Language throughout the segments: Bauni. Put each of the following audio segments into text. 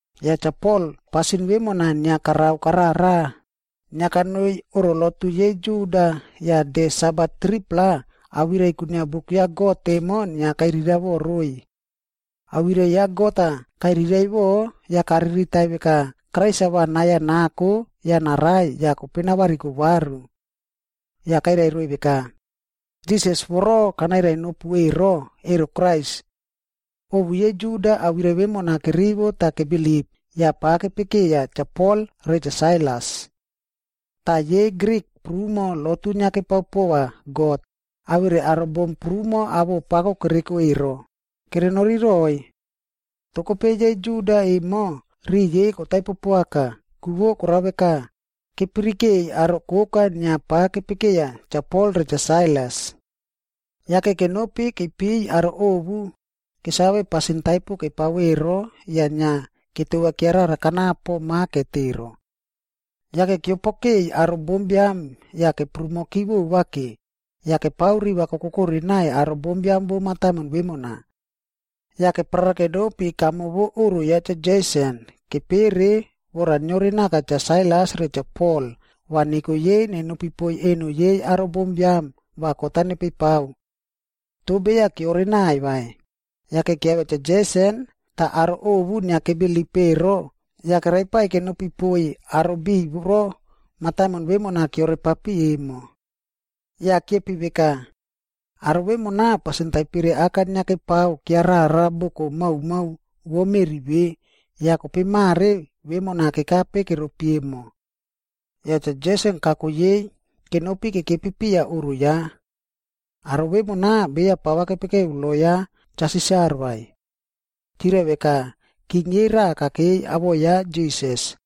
Yah Cha Pol pasin vemona inia karao karara, inia kanoi oꞌro lotu yei Juda yah de Sabat 3-pla awirai kwinia buk ya God emo inia kairiraiꞌvo roiy. Awirai ya God-a kairiraiꞌvo yah kariritai veka Krais-a va nai-a nako yah narai yah kope navariko varu. Yah kairai roiy veka, “Jisas voro kanairai nopu ero, ero Krais.” Ovu yei Juda awirai vemona kerivo tah kebilip yah pa kepekeya Cha Pol re Cha Sailas. Tah yei Grik prumo lotu inia kepao pova God, awere aro bom prumo awoꞌo pako kereko ero, kerenori roiy. Toh kope yei Juda emo riꞌi yei kotaipo poaka, ku korao veka, kepirikei aro koka inia pa kepekeya Cha Pol re Cha Sailas. Yake kenopi keipiy aro ovu kesave pasin taipo kepao ero yah inia ketova kiarara kanapo maket ero. Yah keopokei aro bombiam yah keprumoki vovake, yah kepao riva kokokore naiy aro bombiam vo mataimon vemona. Yah keparara kenopi kamo vo oꞌro ya Cha Jeson kepere vora niore naka Cha Sailas re Cha Pol va neko yei nenopi poiy eno yei aro bombiam va kot-a nepei pao. Toh beya keore naiy vai, yake kiavia Cha Jeson tah aro ovu inia kebilip ero yah keraipaiy kenopi poiy aro biꞌiy voro mataimon vemona keorepapi emo. Yah kiepi veka, “Aro vemona pasin taipere aka inia kepao kiarara boko maomao vo meꞌri ve, yah kope mare vemona kekape keropi emo. Yah Cha Jeson kako yei kenopi kekepi piya oꞌro ya. Aro vemona beya pava kepekeu lo ya Cha Sisar vai. Chirai veka king yei raꞌa kakei, awoꞌo ya Jisas.”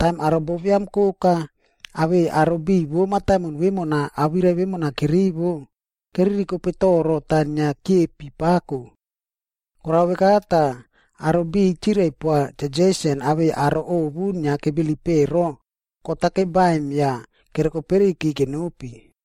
Taim aro bombiam koka awei aro biꞌiy vo mataimon vemona awirai vemona kerivo, keririkope toro tah inia kiepi pako. Korao veka tah aro biꞌiy chirai poa Cha Jeson awei aro ovu inia kebilip ero, kot-a kebaim yah kerokoperiyki kenopi.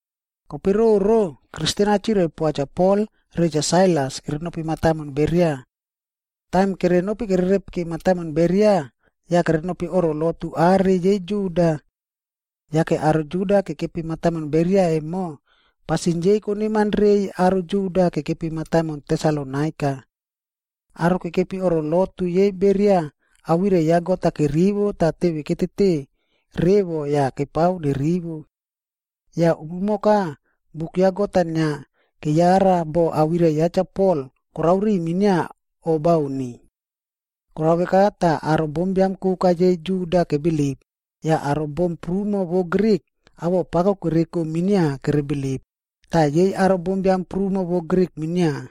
Kope roro yah Kristen-a chirai poa Cha Pol re Cha Sailas kerenopi mataimon Beria. Taim kerenopi kererepiki mataimon Beria, yah kerenopi oꞌro lotu are yei Juda. Yake aro Juda kekepi mataimon Beria emo, pasin yei koneman reiy aro Juda kekepi mataimon Tesalonaika. Aro kekepi oꞌro lotu yei Beria awirai ya God-a kerivo tah teve ketete revo yah kepao nerivo. Yah umumoka buk ya God-a inia keyara boh awirai ya Cha Pol korao ri minia o bauni. Korao veka tah aro bombiam koka yei Juda kebilip, yah aro bom prumo vo Grik awoꞌo pako kereko minia kere bilip, tah yei aro biam prumo vo Grik minia.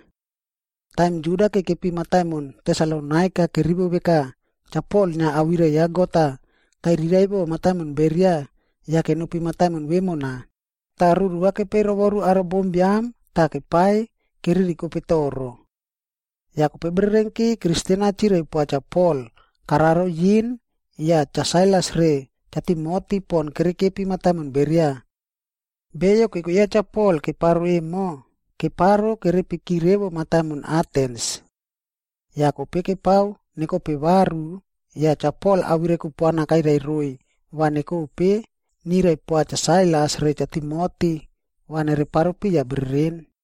Taim Juda kekepi mataimon Tesalonaika kerivo veka Cha Pol inia awirai ya God-a kairiraiꞌvo mataimon Beria, yah kenopi mataimon vemona, tah ruru va kepeiy rovoru aro bombiam tah kepaiy keririkope toro. Yah kope bererenki Kristen-a chirai poa Cha Pol kararo yin yah Cha Sailas re Cha Timoti pon kerekepi mataimon Beria. Beyo keko ya Cha Pol keparo emo, keparo keperiaki revo mataimon Atens. Yah kope kepao nekope varu yah Cha Pol awirai kupuana kairai roiy va nekope nirai poa Cha Sailas re Cha Timoti va nereparo piya bereren.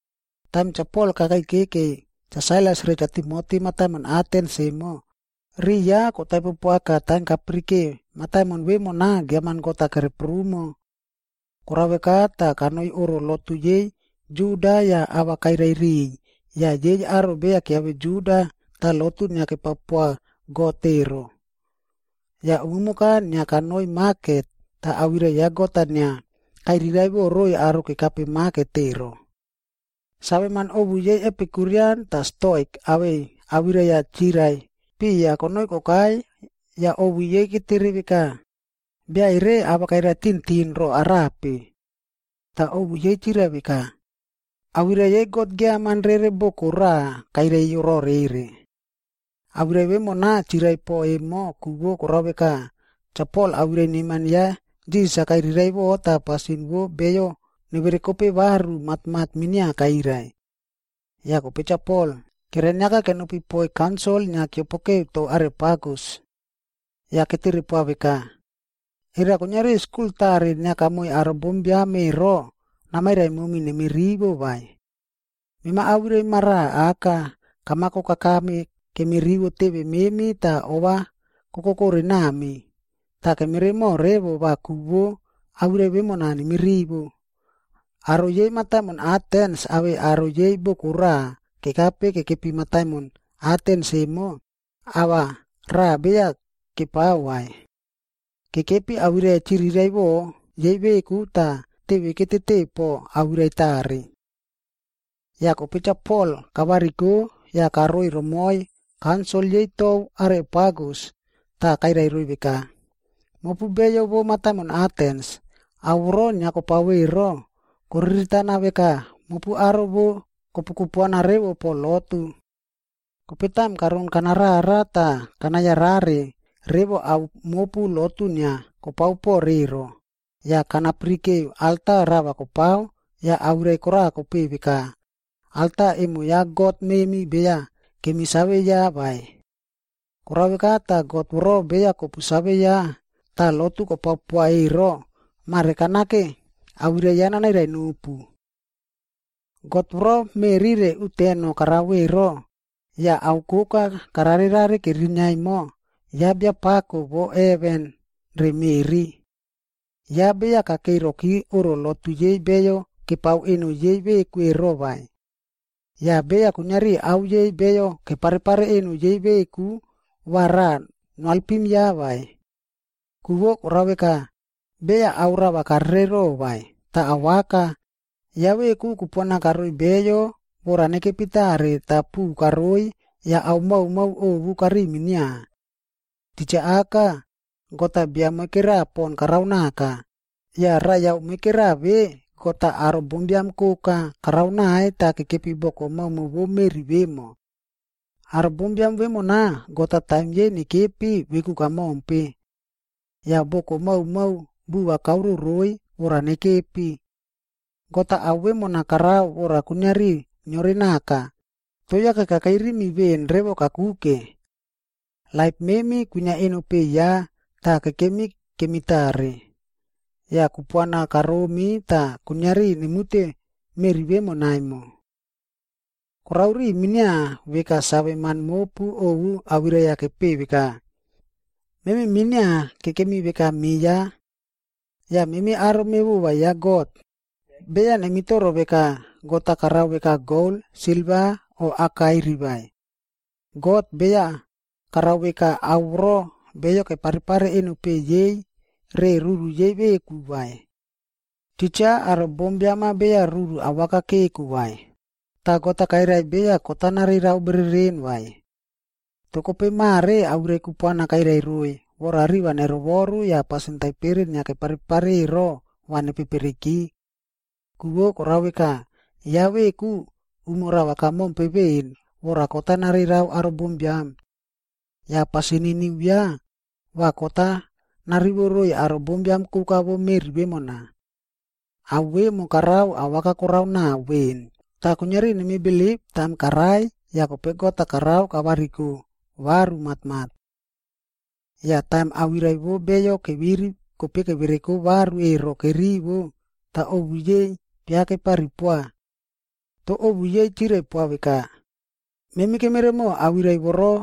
Taim Cha Pol kakei kekeiy Cha Sailas re Cha Timoti mataimon Atens emo, riꞌi ya kotaipo poaka taim kapirike mataimon vemona giaman god-a kereprumo. Korao veka tah kanoi oꞌro lotu yei Juda yah ava kairai riꞌiy yah yei aro beya kiave Juda tah lotu inia kepao poa God ero. Yah umumoka inia kanoi maket tah awirai ya God-a inia kairiraiꞌvo roiy aro kekape maket ero. Saveman ovu yei Epikurian tah Stoika awei awirai-a chirai piya konoi kokai yah ovu yei ketere veka, “Bia ere ava kairai tintin ro arape?” Tah ovu yei chirai veka, “Awirai yei god giaman rere boko raꞌa kairai rore ero.” Awirai vemona chirai po emo ku korao veka, Cha Pol awirai neman ya Jisas-a kairiraiꞌvo tah pasin vo beyo neverekope varu matmat minia kairai. Yah kope Cha Pol keraniaka kenopi poiy kaunsil inia keopoke tou Areopagus.b Yah ketere poa veka, “Era kuiniari skul tare inia kamoiy aro bombiam ero namairai momi nemi rivo vai? Mema awirai maraꞌa aka kamako kakame kemi rivo teve memi tah ova kokokore nami, tah kemeremo revo va ku vo awirai vemona nemi rivo.” Aro yei mataimon Atens awei aro yei boko raꞌa kekape kekepi mataimon Atens emo, ava raꞌa beya kepao vai. Kekepi awirai-a chiriraiꞌvo yei veku tah teve ketete po awirai tare. Yah kope Cha Pol kavariko yah karoi romoiy kaunsil yei tou Areopagus tah kairai roiy veka, “Mopu beyo vo mataimon Atens, ao voro inia kopao ero, koriritana veka mopu aro vo kopu kupuana revo po lotu. Kope taim karon kanarara tah kana yarare revo ao mopu lotu inia kopao po ero, yah kana pirike alta rava kopao yah awirai kora kopeꞌe veka, ‘Alta emo ya God memi beya kemi save ya vai.’ Korao veka tah God voro beya kopu save ya tah lotu kopao poa ero, mare kanake awirai ya nanairai nopu. “God voro meꞌri re uteno karao ero, yah ao koka kararerare kerinia emo, ya Biapako vo heven re meꞌri. Ya beya kakei roki oꞌro lotu yei beyo kepao eno yei veku ero vai. Yah beya kuiniari ao yei beyo keparepare eno yei veku va raꞌa noalpim ya vai. Ku vo korao veka, beya ao rava karerero vai, tah awaka, ya veku kupuana karoiy beyo vora nekepi tare tah puꞌu karoi yah ao maomao ovu kariꞌiy minia. Titja aka, God-a bia moikera pon karao naka, yah raiyao moikera ve God-a aro bombiam koka karao naiy tah kekepi boko maomao vou meꞌri vemo. Aro bombiam vemona God-a taim yei nekepi veku kamompe. Yah boko maomao buva kaoro roiy vora nekepi. God-a ao vemona karao vora kuiniari niore naka, toh yake kakei rimi veꞌen revo kakuke. “ ‘Laip memi kwinia eno peꞌe ya tah kekemi kemi tare. Yah kupuana karomi tah kuiniari nemute meꞌri vemona emo.’ “Korao ri minia veka saveman mopu ovu awirai-a kepeꞌe veka, ‘Memi minia kekemi veka me ya.’ “Yah memi aro mevova ya God, beya nemitoro veka God-a karao veka gol, silva o akairi vai. God, beya karao veka ao voro beyo keparepare eno peꞌe yei re ruru yei veku vai. Titja aro bombiam-a beya ruru awaka keko vai, tah God-a beya kairai kot-a narerao bereren vai. Toh kope mare awirai kupuana kairai roiy vora riva nerovoru yah pasin taipere inia keparepare ero va nepepereki. Ku vo korao veka, ya veku umo rava kamompe veꞌen vora kot-a narerao aro bombiam. Yah pasin niniu ya, va kot-a narivo roiy aro bombiam koka vo meꞌri vemona. Ao vemo karao awaka korao nao veꞌen tah kuiniari nemi bilip taim karai yah kope God-a karao kavariko varu matmat.” Yah taim awirai vo beyo keviri kope kevereko varu ero kerivo, tah ovu yei pia kepari poa. Toh ovu yei chirai poa veka, “Memi kemeremo awirai voro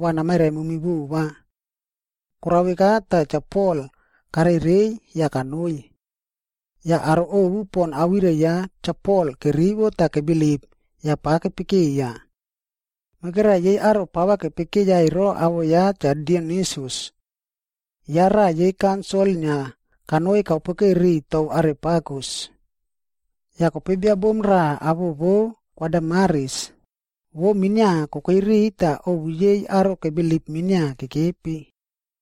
va namairai momi vova.” Korao veka tah Cha Pol karereiy yah kanoi. Yah aro ovu pon awirai ya Cha Pol kerivo tah kebilip yah pa kepekeiya. Moikera yei aro pava kepekeya ero awoꞌo ya Cha Dionisius. Ya raꞌa yei kaunsil inia kanoi kaopokeu riꞌiy tou Areopagus. Yah kope bia bom raꞌa awoꞌo vou Kwa Damaris, vou minia kokei riꞌiy tah ovu yei aro kebilip minia kekepi.